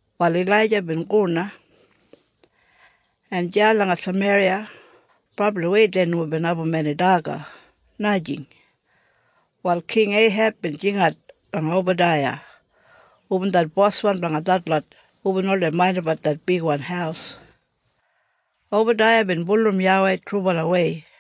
Wal Ilaija bin go na. En deya langa Sameriya brabliwei dei nomo bin abum eni daga, najing. Wal King Eiheb bin jingat langa Obadaiya hubin det boswan blanga detlot hubin oldei maindimbat det bigwan haus. Obadaiya bin bulurrum YAWEI trubalawei.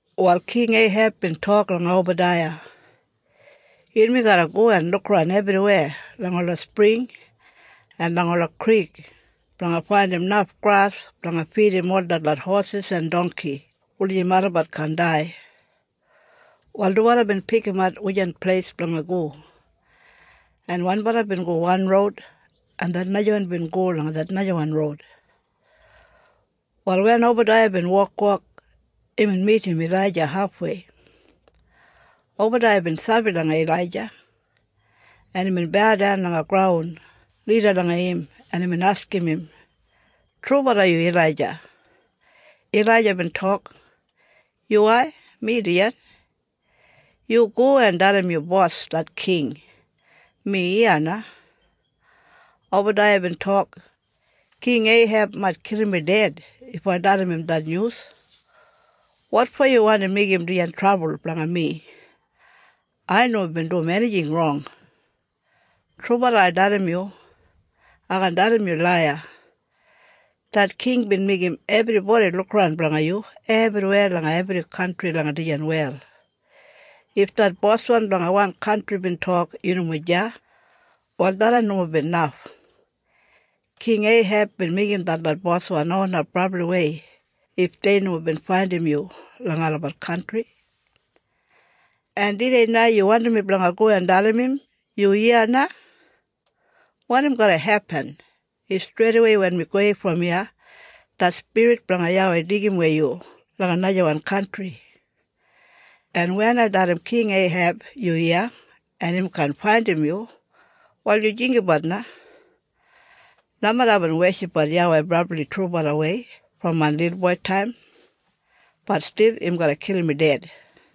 Wal King Eiheb bin tok langa Obadaiya, “Yunmi garra go en lukaran ebriweya langa ola spring en langa ola krik blanga faindim naf gras blanga fidim ol detlot hosis en dongki wulijim olabat kaan dai.” Wal dubala bin pikimat wujan pleis blanga go, en wanbala bin go wan roud, en det najawan bin go langa det najawan roud. Wal wen Obadaiya bin wokwok, imbin midim Ilaija hafwei. Obadaiya bin sabi langa Ilaija. En imbin baudan langa graun lida langa im en imbin askim im, “Trubala yu Ilaija?” Ilaija bin tok, “Yuwai, mi dijan. Yu go en dalim yu bos, det king, mi iya na.” Obadaiya bin tok, “King Eiheb mait kilim mi ded if ai dalim im det nyus. Wotfo yu wandi meigim dijan trabul blanga mi? Ai nomo bin dum enijing rong. Trubala ai dalim yu. Ai kaan dalim yu laiya. Det king bin meigim ebribodi lukaran blanga yu ebriweya langa ebri kantri langa dijan wel. If det boswan blanga wan kantri bin tok yu nomo deya, wal tharran nomo bin naf. King Eiheb bin meigim detlot boswan onap brabliwei if dei nomo bin faindim yu langa olabat kantri. En tudei na, yu wandim mi blanga go en dalim im, ‘Yu iya na’? Wanim garra hepin if streidawei wen mi gowei brom iya det spirit blanga YAWEI deigimwei yu langa najawan kantri? En wen ai dalim King Eiheb yu iya en im kaan faindim yu, wal yu jinggabat na. Nomeda aibin weshipbat YAWEI brabli trubalawei brom main lilboitaim, bat stil im garra kilim mi ded.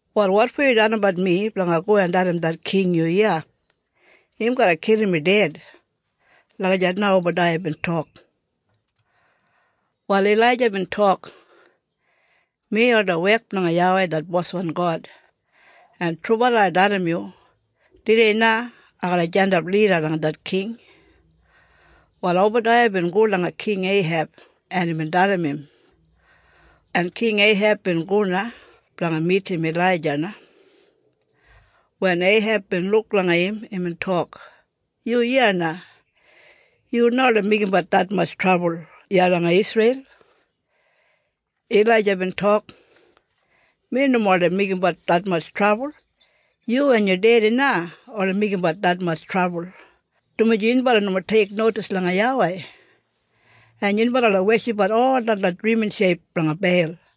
Wal wotfo yu dalimbat mi blanga go en dalim det king yu iya? Im garra kilim mi ded.” Lagijat na Obadaiya bin tok. Wal Ilaija bin tok, “Mi oldei wek blanga YAWEI det boswan God, en trubala ai dalim yu. Tudei na ai garra jandap lida langa det king.” Wal Obadaiya bin go langa King Eiheb en imbin dalim im, en King Eiheb bin go na blanga midim Ilaija na. Wen Eiheb bin luk langa im imbin tok, “Yu iya na. Yu na oldei meigimbat detmatj trabul iya langa Isreil.” Ilaija bin tok, “Mi nomo oldei meigimbat detmatj trabul. Yu en yu dedi na oldei meigimbat detmatj trabul, dumaji yunbala nomo teiknodis langa YAWEI, en yunbala oldei weshipbat ol detlot drimin sheip blanga Beil.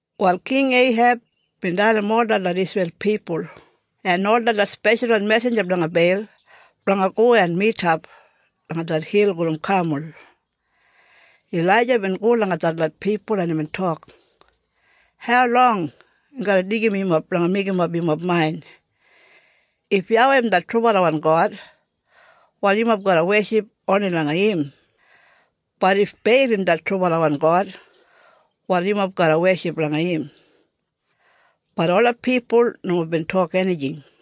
Wal King Eiheb bin dalim ol detlot Isreil pipul en ol detlot speshalwan mesinja blanga Beil blanga go en midap langa det hil gulum Kamul. Ilaija bin go langa detlot pipul en imbin tok, “Haulong im garra deigim yumob blanga meigimap yumob main? If YAWEI im det trubalawan God, wal yumob garra weship oni langa im, bat if Beil im det trubalawan god, wal yumob garra weship langa im!” Bat ola pipul nomo bin tok enijing.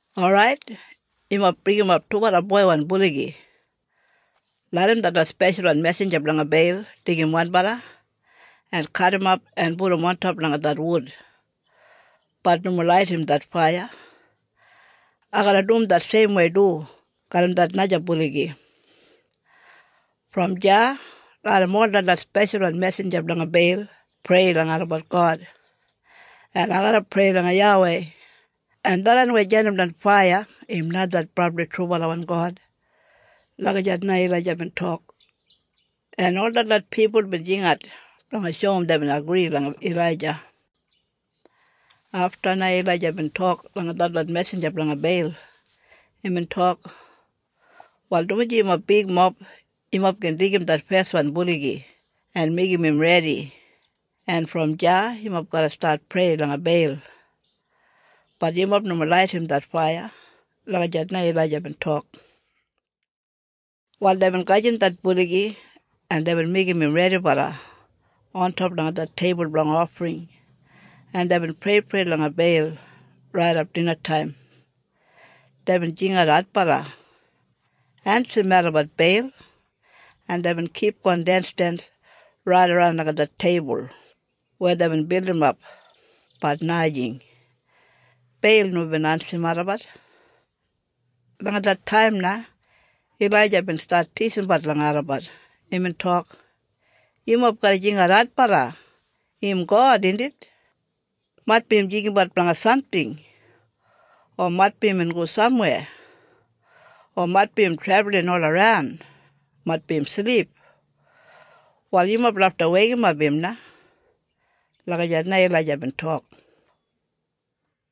Orait. Yumob bringimap dubala boiwan buligi. Larram detlot speshalwan mesinja blanga Beil deigim wanbala, en kadimap en pudum ontop langa det wud, bat nomo laidim det faiya. Ai garra dum det seimwei du garram det naja buligi. Brom deya larram ol detlot speshalwan mesinja blanga Beil prei langa olabat god, en ai garra prei langa YAWEI, en tharran weya jandimdan faiya im na det brabli trubalawan God.” Lagijat na Ilaija bin tok. En ol detlot pipul bin jingat blanga shoum deibin agri langa Ilaija. Afta na Ilaija bin tok langa detlot mesinja blanga Beil. Imbin tok, “Wal, dumaji yumob bigmob, yumob gin deigim det feswan buligi en meigim im redi en brom deya yumob garra stat prei langa Beil, bat yumob nomo laidim det faiya.” Lagijat na Ilaija bin tok. Wal deibin gajim det buligi en deibin meigim im redibala ontop langa det teibul blanga ofring en deibin preiprei langa Beil raidap dinataim. Deibin jingat adbala, “Ensim melabat, Beil!” En deibin kipgon densdens raidaran langa det teibul weya deibin bildimap. Bat najing. Beil nomo bin ensim olabat. Langa det taim na Ilaija bin stat tisimbat langa olabat. Imbin tok, “Yumob garra jingat adbala. Im god, indit? Maitbi im jinggabat blanga samting, o maitbi imbin go samweya o maitbi im trebulin olaran. Maitbi im silip. Wal yumob lafta weikimap im na.” Lagijat na Ilaija bin tok.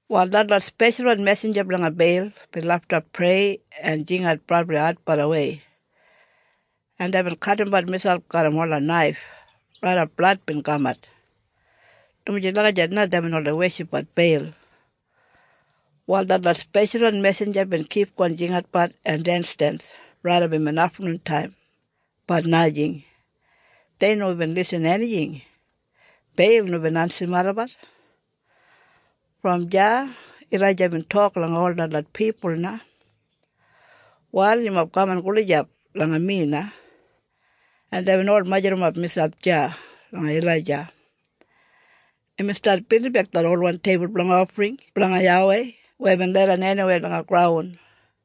Wal detlot speshalwan mesinja blanga Beil bin lafta prei en jingat brabli adbalawei en deibin kadimbat miselp garram ola naif raidap blad bin kamat, dumaji lagijat na deibin oldei weshipbat Beil. Wal detlot speshalwan mesinja bin kipgon jingatbat en densdens raidap imbin aftanuntaim, bat najing! Dei nomo bin lisin enijing! Beil nomo bin ensim olabat. Brom deya Ilaija bin tok langa ol detlot pipul na, “Wal yumob kaman gulijap langa mi na.” En deibin ol majurrumap miselp deya langa Ilaija. Imbin stat bildimbek det olwan teibul blanga ofring blanga YAWEI weya bin leidan eniweya langa graun.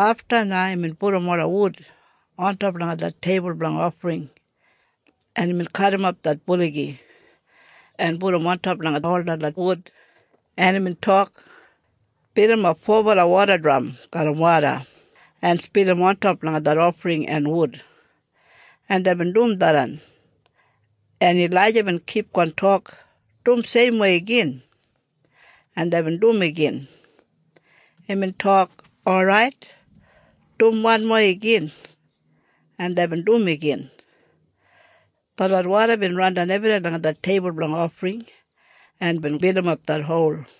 Afta na imbin pudum ola wud ontop langa det teibul blanga ofring, en imbin kadimap det buligi, en pudum ontop langa ol detlot wud. En imbin tok, “Bilimap fobala wodadram garram woda en spilim ontop langa det ofring en wud.” En deibin dum tharran. En Ilaija bin kipgon tok, “Dum seimwei igin!” En deibin dum igin. Imbin tok, “Orait, dum wanmo igin.” En deibin dum igin. Detlot woda bin randan ebriweya langa det teibul blanga ofring en bin bilimap det hol.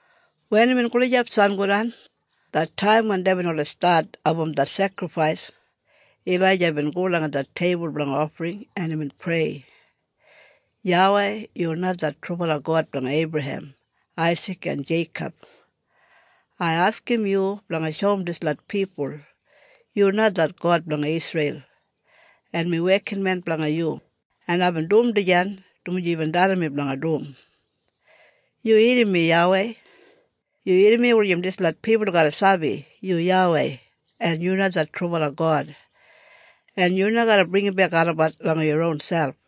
Wen imbin gulijap sangodan, det taim wen deibin oldei stat abum det sekrifais, Ilaija bin go langa det teibul blanga ofring en imbin prei, “YAWEI, yu na det trubala God blanga Eibrahem, Aisik en Jeikob. Ai askim yu blanga shoum dislot pipul yu na det God blanga Isreil en mi wekinmen blanga yu en aibin dum dijan dumaji yubin dalim mi blanga dum. Yu irrim mi YAWEI. Yu irrim mi wulijim dislot pipul garra sabi yu YAWEI en yu na det trubala God en yu na garra bringimbek olabat langa yu ronselp.”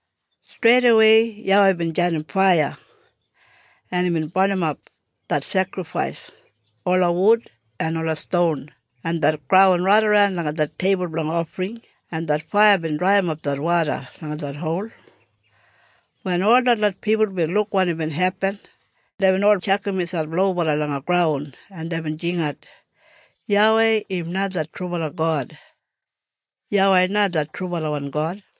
Streidawei YAWEI bin jandim faiya, en imbin barnimap det sekrifais, ola wud, en ola ston en det graun raidaran langa det teibul blanga ofring en det faiya bin draiyimap det woda langa det hol. Wen ol detlot pipul bin luk wanim bin hepin deibin ol tjakam miselp lobala langa graun en deibin jingat, “YAWEI im na det trubala God! YAWEI na det trubalawan God!”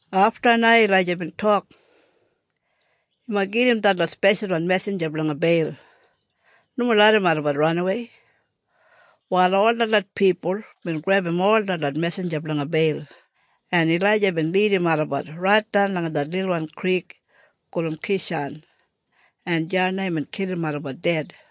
Afta na Ilaija bin tok, “Yumob gedim detlot speshalwan mesinja blanga Beil. Nomo larram olabat ranawei!” Wal ol detlot pipul bin grebum ol detlot mesinja blanga Beil, en Ilaija bin lidim olabat raitdan langa det lilwan krik gulum Kishan en deya na imbin kilim olabat ded.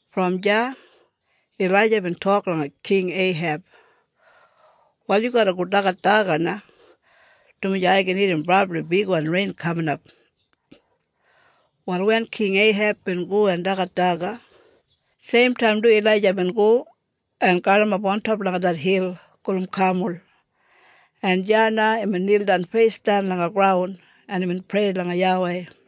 Brom deya Ilaija bin tok langa King Eiheb, “Wal yu garra go dagat daga na, dumaji ai gin irrim brabli bigwan rein kaminap.” Wal wen King Eiheb bin go en dagat daga, seimtaim du Ilaija bin go en galimap ontop langa det hil gulum Kamul en deya na imbin nildan feisdan langa graun en imbin prei langa YAWEI.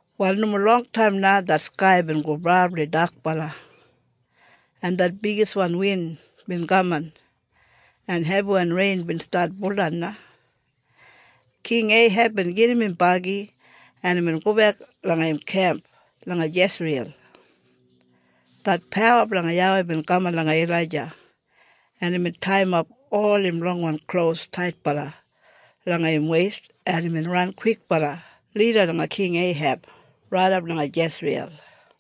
Wal nomo longtaim na det skai bin go brabli dakbala en det bigiswan win bin kaman en hebiwan rein bin stat buldan na. King Eiheb bin gedim im bagi en imbin gobek langa im kemp langa Jesriyel. Det pawa blanga YAWEI bin kaman langa Ilaija en imbin taiyimap ol im longwan klos taitbala langa im weist en imbin ran kwikbala lida langa King Eiheb raidap langa Jesriyel.